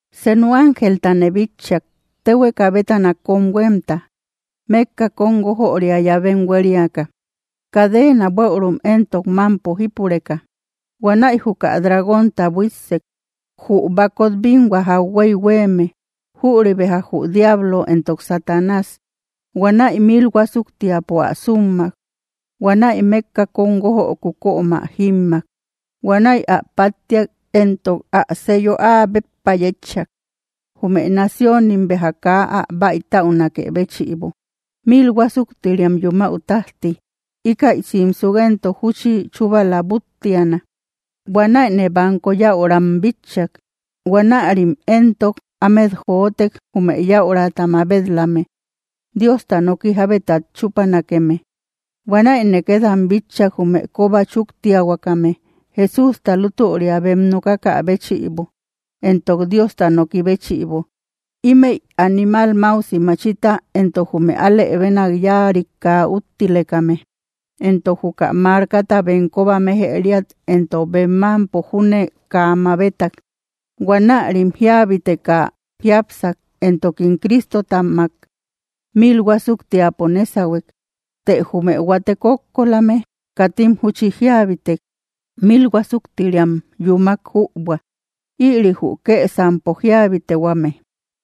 Senu ángeltane bitchak, téhueka bétana kóm huémta, mékka kóm guójöria llavem huériaka, cadeena bueürum éntok mámpo jípureka. Huanäi juka dragónta buíssek, jü bakot binhua jakhuey huéeme, jüri beja jü diablo entok Satanás. Huanäi mil huásuktiapo ä súmmak. Huanäi mékka kóm guójöku kömä jímmak. Huanäi ä páttiak, entok ä sello áa béppa yétchak, jume naciónim béja kaa ä bäitatäunakë béchïbo, mil huásuktiriam yumäu tájti. Íkäi simsuk éntok júchi chúbala búttiana. Huanäine banko yäuram bitchak. Huanärim éntok ámet jotek, jume yäurata mabet‑lame Diosta noki jábetat chúpanakeme. Huanäine két am bitchak, jume kóba chúktiahuakame Jesústa lútüria bem nokakä béchïbo entok Diosta noki béchïbo. Ímëi animal máusi machita entok jume alë bénak yáarik kaa úttilekame, entok juka markata bem kóba méjëriat entok bem mámpo júne kaa mabetak. Huanärim jíabiteka jiápsak, entokim Cristotamak mil huásuktiapo nésahuek. Të jume huate kókkolame katim júchi jíabitek, mil huásuktiriam yúmak jübua. Ïri jü kësampo jíabitehuame.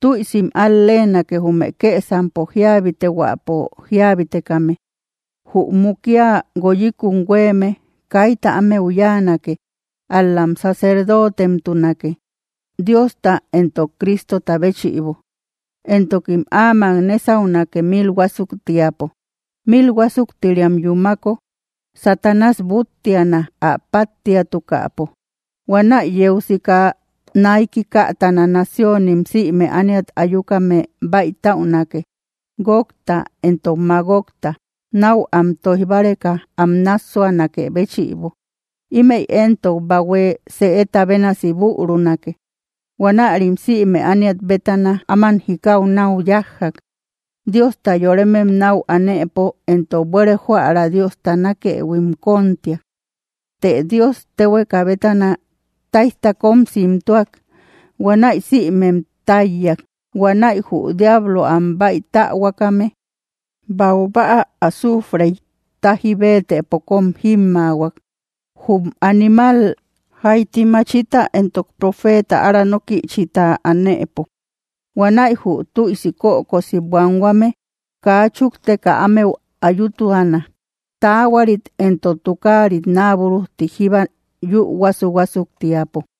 ¡Tüisim al-leenake, jume kësampo jíabitehuäpo jíabitekame! Jü mukia guoyikun huéeme kaita ámeu yáanake, ál‑lam sacerdootemtunake, Diosta entok Cristota béchïbo, entokim áamak nésaunake mil huásuktiapo. Mil huásuktiriam yúmako, Satanás búttiana, ä páttiatukäpo. Huanäi yeu sika naiki kätana naciónim, sïme ániat ayukame bäitäunake, Gogta entok Magogta, náu am tóij báreka am nássuanakë béchïbo. Ímëi éntok bahue sëeta bénasi bürunake. Huanärim sïme ániat bétana ámam jikau náu yájjak. Diosta yoremem nau anëpo entok buére jóära Diosta nákëhuim kóntiak. Të Dios téhueka bétana táijta kóm simtuak. Huanäi sïmem táiyak. Huanäi jü diablo am báitähuakame baubäa azuufrey táji béetëpo kóm jímmaahuak, jum animal janti machita entok profeeta ára nókïchita anëpo. Huanäi jü tüisi kökosi buanhuame kaa chúkteka ámeu ayutuana, taahuarit entok tukaarit naa búrujti jíba yü huásu‑huásuktiapo.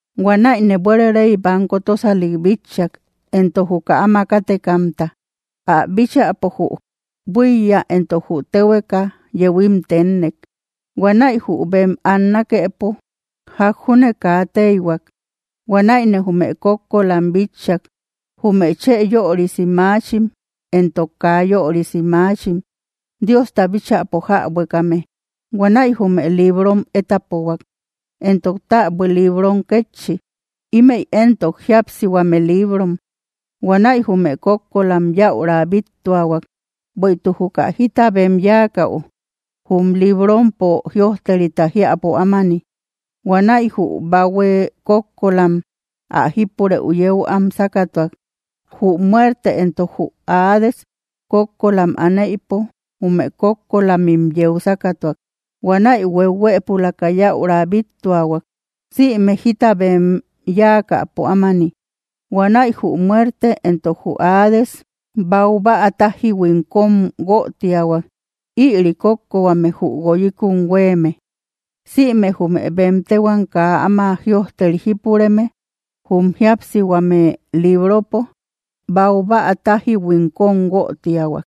Huanäine buére rey banko tósalik bitchak, entok juka áma kátekamta. Ä bíchäpo jü buíya entok jü téhueka yehuim ténnek. Huanäi jü bem annakepo ják júne kaa téihuak. Huanäine jume kókkolam bitchak, jume chë yörisi maachim entok kaa yörisi maachim, Diosta bíchäpo jäbuekame. Huanäi jume librom étapohuak, entok täbui librom kétchi; ímëi éntok jíapsihuame liibrom. Huanäi jume kókkolam yäura bíttuahuak, bueïtuk juka jita bem yáakäu jum librompo jïojterita jiäpo ámani. Huanäi jü bahue kókkolam ä jípurëu yeu am sákatuak. Jü muerte entok jü Hades kókkolam aneïpo jume kókkolamim yeu sákatuak. Huanäi huehuëpulaka yäura bíttuahuak, sïme jita bem yáakäpo ámani. Huanäi jü muerte entok jü Hades baubäa tájihuim kóm guötiahuak; ïri kókkohuame jü guoyikun huéeme. Sïme jume bem téhuam kaa áma jïojteri jípureme jum jíapsihuame libropo, baubäa tájihuim kóm guötiahuak.